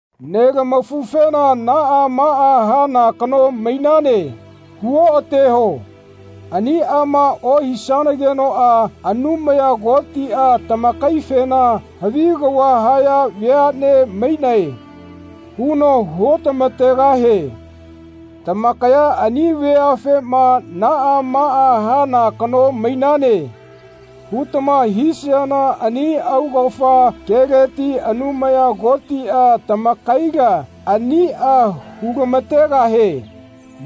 Nelamafufena “Naꞌa maꞌa hana kano mainane.” hu-oꞌateho. Aniꞌama ohisagenoꞌa Anumaya Kotiꞌa tamakaifena “Havi kava haya veaꞌne mainae.” huno hu-otama-tegahie. Tamakaya ani veafema “Naꞌa maꞌa hana kano mainane.” hutama hisayana ani augafa keleti Anumaya Kotiꞌa tamakaila aniꞌa hu-lama-tegahie.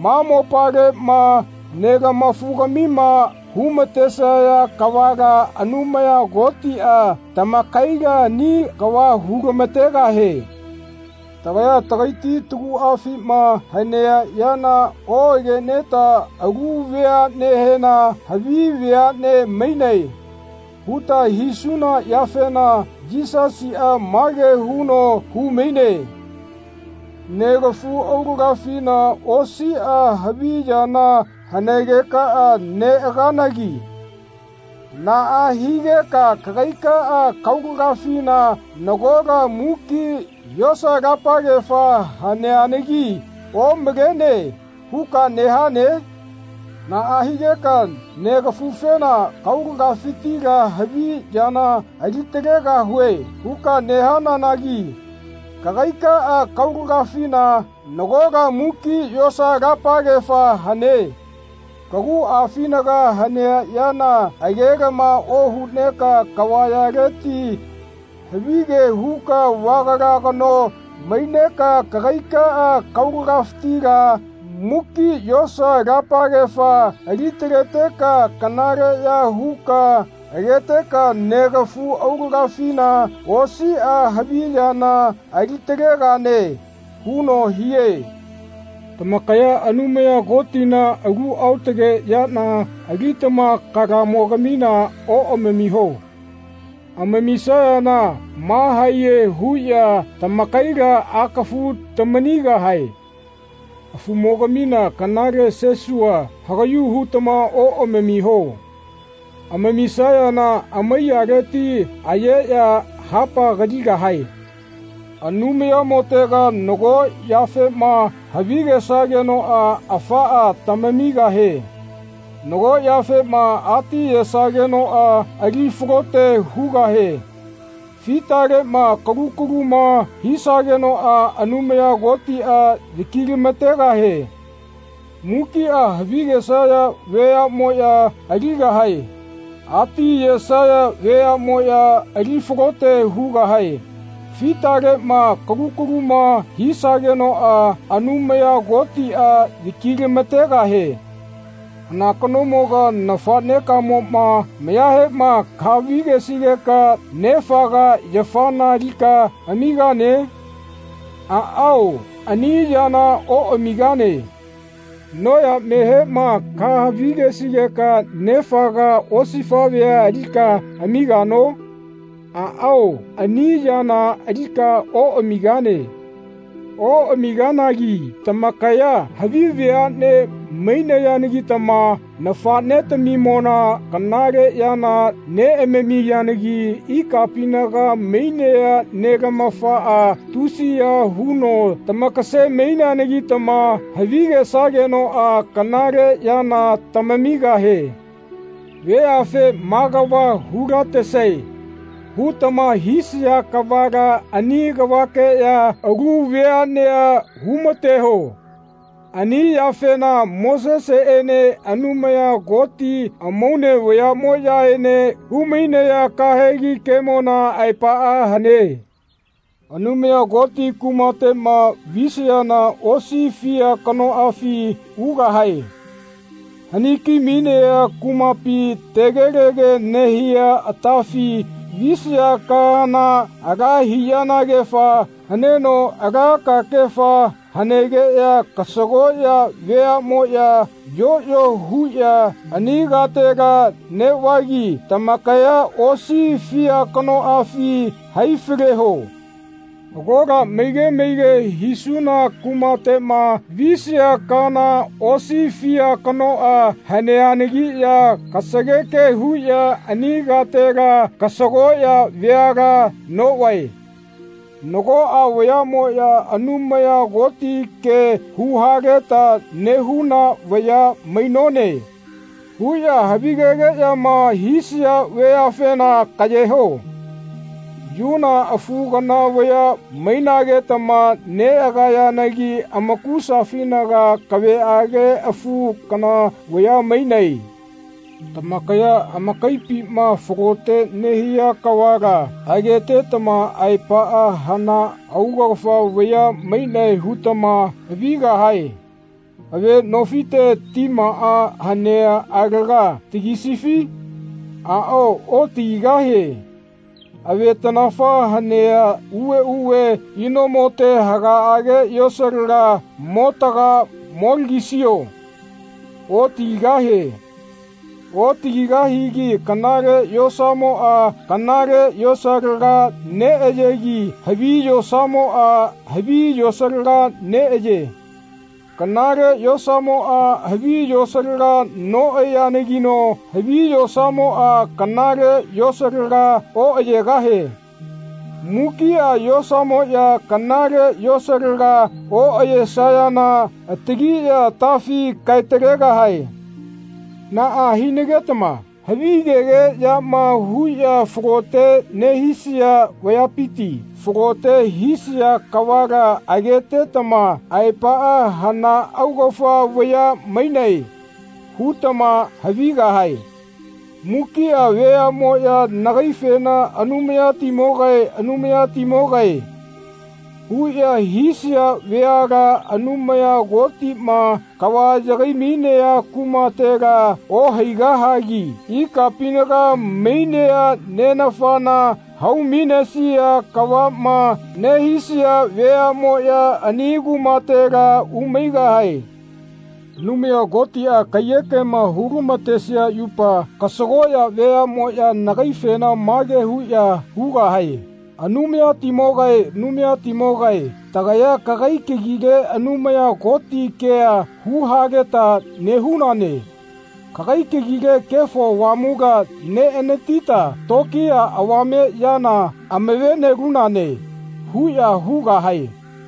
Ma mopaleꞌma nelama-fugamima hu-ma-tesaya kavala Anumaya Kotiꞌa tamakaila ani kava hu-lama-tegahie. Tagaya tagaiti taguꞌafima hanea yana oꞌageneta alu veaꞌnehena “Havi veaꞌne mainae.” huta hisuna yafena Yisasiꞌa mage huno hu-maine “Negafu aulagafina osiꞌa havi yana hanegeka neꞌagananagi naꞌa higeka kagaikaꞌa kaulagafina nagola muki yosa-lapagefa haneanagi ‘Omalene.’ huka nehane? Naꞌa higeka nega-fufena ‘Kaulagafitila havi yana ali-talegahue.’ huka nehananagi kagaikaꞌa kaulagafina nagola muki yosa-lapagefa hane. Kaguꞌafinaga hanea yana agelama ohuneka kavayaleti havige huka vagala kano maineka kagaikaꞌa kaulagafitila muki yosa-lapagefa ali-taleteka kanaleꞌya huka ageteka negafu aulagafina osiꞌa havi yana ali-talegane huno hie. Tamakaya Anumaya Kotina alu aotage yana alitama kalamogamina oꞌamamiho. Amamisayana mahaiye huꞌya tamakaila akafu tamanigahae. Afumogamina kanale sesua hagaꞌyu hutama oꞌamamiho. Amamisayana amaiyaleti ayeꞌya hapa kaligahae.” Anumayamotega nago yafema havigesagenoꞌa afaꞌa tamamigahie. Nago yafema atiyesagenoꞌa ali falote hugahie. Fitaleꞌma akalu kaluma hisagenoꞌa Anumaya Kotiꞌa yaki-lama-tegahie. Mukiꞌa havigesaya veaꞌmoꞌya aligahae. Ati ayesaya veaꞌmoꞌya ali falote hugahae. Fitaleꞌma akalu kaluma hisagenoꞌa Anumaya Kotiꞌa yaki-lama-tegahie. Hana kanomoga nafaꞌnekamoꞌma mayahema kahavi-gesigeka nefaga yafana alika amigane? Aꞌao ani yana oꞌamigane. Noyamehema kahavi-gesigeka nefaga osifaꞌvea alika amigano? Aꞌao ani yana alika oꞌamigane. Oꞌamiganagi tamakaya havi veaꞌne mainayanagitama nafaꞌnetamimona kanale yana neꞌamamiyanagi ikapinaga mainea nelamafaꞌa tusiya huno tamakase-maineanagitama havigesagenoꞌa kanale yana tamamigahie. Veafe “Maꞌa kava hu-latesae.” hutama hisaya kavala ani kavakeꞌya alu veaꞌnea hu-mateho. Ani yafena Moseseꞌene Anumaya Koti amaune vayaꞌmoꞌyaene hu-mainaya kahegi kemona aepaꞌa hane. Anumaya Koti kumateꞌma visayana osi fia kanoꞌafi ugahae. Hani-ki-mainea kumapi tegelege nehia atafi visaya kaana ala hiꞌyenagefa haneno ala kakefa hanegeꞌya kasagoꞌya veaꞌmoꞌya yoꞌyo huꞌya ani katela neꞌvagi tamakaya osi fia kanoꞌafi hai-faleho. Agola maige maige hisuna kumateꞌma visaya kaana osi fia kanoꞌa haneanagiꞌya kasageke huꞌya ani katela kasagoꞌya veala noꞌvae. Nagoꞌa vayaꞌmoꞌya “Anumaya Koti ke hu-haleta nehuna vaya mainone” huꞌya havigegeꞌyama hisaya vayafena kaꞌyeho. Yuna afu kana vaya mainagetama neꞌagayanagi amakusafinaga kaveꞌage afu kana vaya mainae. Tamakaya amakaipima falote nehia kavala agetetama aepaꞌa hana augafa vaya mainae hutama havigahae. Ave nofite timaꞌa hanea alaga tagisifi? Aꞌao otagigahie. Avetanafa hanea uveꞌuve inomote hagaꞌage yosalaga motaga molagisio? Otagigahie. Otagigahigi kanale yosamoꞌa kanale yosalaga neꞌayegi havi yosamoꞌa havi yosalaga neꞌaye. Kanale yosamoꞌa havi yosalaga noꞌayeanagino havi yosamoꞌa kanale yosalaga oꞌayegahie. Mukiꞌa yosamoꞌya kanale yosalaga oꞌayesayana atagiꞌya atafi kae-talegahae. Naꞌa hinagetama havigegeꞌyama huꞌya falote nehisaya vayapiti falote hisia kavala agetetama aepaꞌa “Hana augafa vaya mainae.” hutama havigahae. Mukiꞌa veaꞌmoꞌya nagaifena “Anumayatimogae Anumayatimogae.” huꞌya hisaya veala Anumaya Kotiꞌma kava yagai-mainea kumatela ohaigahagi ikapinaga mainea Nenafana hau-mainesia kavaꞌma nehisaya veaꞌmoꞌya ani kumatela umaigahae. Anumaya Kotiꞌa kaiyekema hu-matesea yupa kasagoꞌya veaꞌmoꞌya nagaifena mage huꞌya hugahae “Anumayatimogae Anumayatimogae tagaya kagai kagile Anumaya Koti kea hu-haleta nehunane. Kagai kagile Kefo Avamula neꞌanatita tokiya avame yana amave-nelunane.” huꞌya hugahae.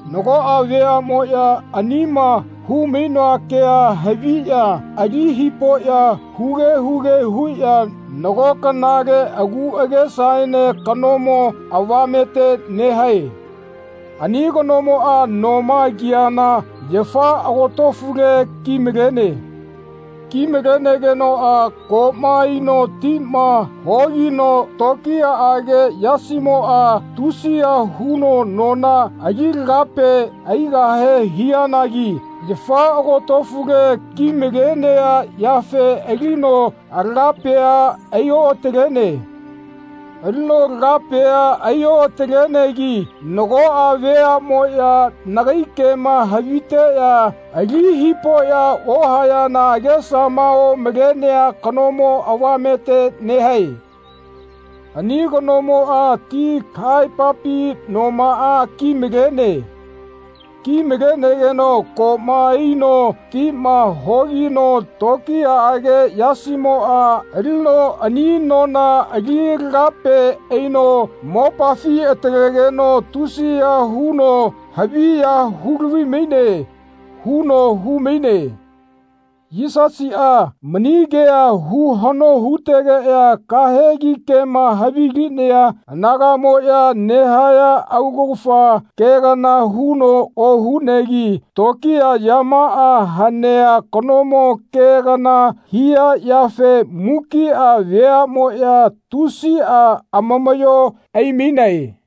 Nagoꞌa veaꞌmoꞌya anima hu-mainoa kea haviꞌya ali hipoꞌya huge huge huꞌya nago kanale agu agesaene kanomo avamete nehae. Ani kanomoꞌa noma kiana yafa agotofule ki-malene. Ki-malenegenoꞌa koꞌma aino tima hogino tokiyaꞌage yasimoꞌa tusiya huno nona ali-lagape aigahe hianagi yafa agotofule ki-malenea yafe alino lagapea ai-oꞌatalene. Alino lagapea ai-oꞌatalenegi nagoꞌa veaꞌmoꞌya nagai kema haviteꞌya ali hipoꞌya ohayana agesama omalea kanomo avamete nehae. Ani kanomoꞌa ti kahaepapi nomaꞌa ki-malene. Ki-malenegeno koꞌma aino tima hogino tokiyaꞌage yasimoꞌa alino ani nona ali lagape aino mopafi atalegeno tusiya huno haviya hu-lavi-maine huno hu-maine. Yisasiꞌa mani kea hu-haꞌno hutegeꞌya kahegi kema havilinaya anagaꞌmoꞌya nehaya augafa ke kana huno ohunegi tokiya yamaꞌa hanea kanomo ke kana hia yafe mukiꞌa veaꞌmoꞌya tusiꞌa amamaꞌyo ai-mainae.